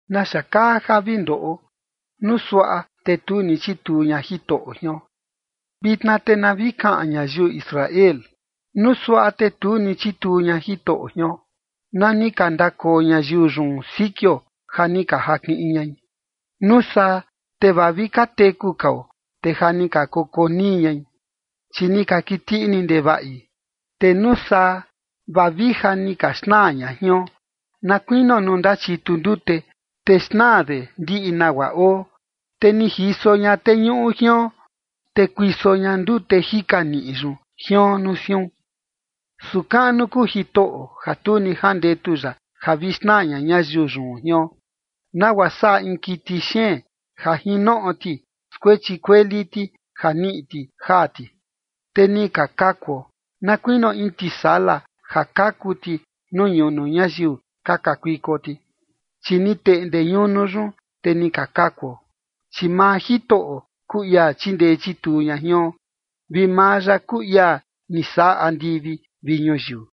¿Naxa kaa ja vi ndoꞌo, nuu suaꞌa te tu ni chituu ña Jitoꞌo jion? Vitna te na vi kaꞌan ñayiu Israel: Nuu suaꞌa te tu ni chituu ña Jitoꞌo jion, na ni ka ndakoo ñayiu yun sikio ja ni ka jakiꞌin ñai, nuu saa, te vaa vi ka teku kao, te ja ni ka koko nii ñai, chi ni ka kiti ini ndevaꞌi. Te nuu saa, vaa vi ja ni ka xnaa ña jion, na kuinio nuu ndachitu ndute, te xnaa de ndiꞌi nagua oo, te ni jiso ña teñuꞌu jion, te kuiso ña ndute jika niꞌi yun jion nuu siun. Su kaꞌnu kuu Jitoꞌo ja tu ni jandetu ya ja vi xnaa ña ñayiu yun jion, nagua saꞌa in kiti xeen, ja jin noꞌo ti skuechi kueli ti ja niꞌi ti jaa ti. Te ni ka kakuo, na kuinio in tisala ja kaku ti nuu ñunu ñayiu ka kakuiko ti, Chi ni teꞌnde ñunu yun, te ni ka kakuo. Chi maa Jitoꞌo kuu ia chindee chituu ña jion, vi maa ya kuu ia ni saꞌa andivi vi ñuyiu.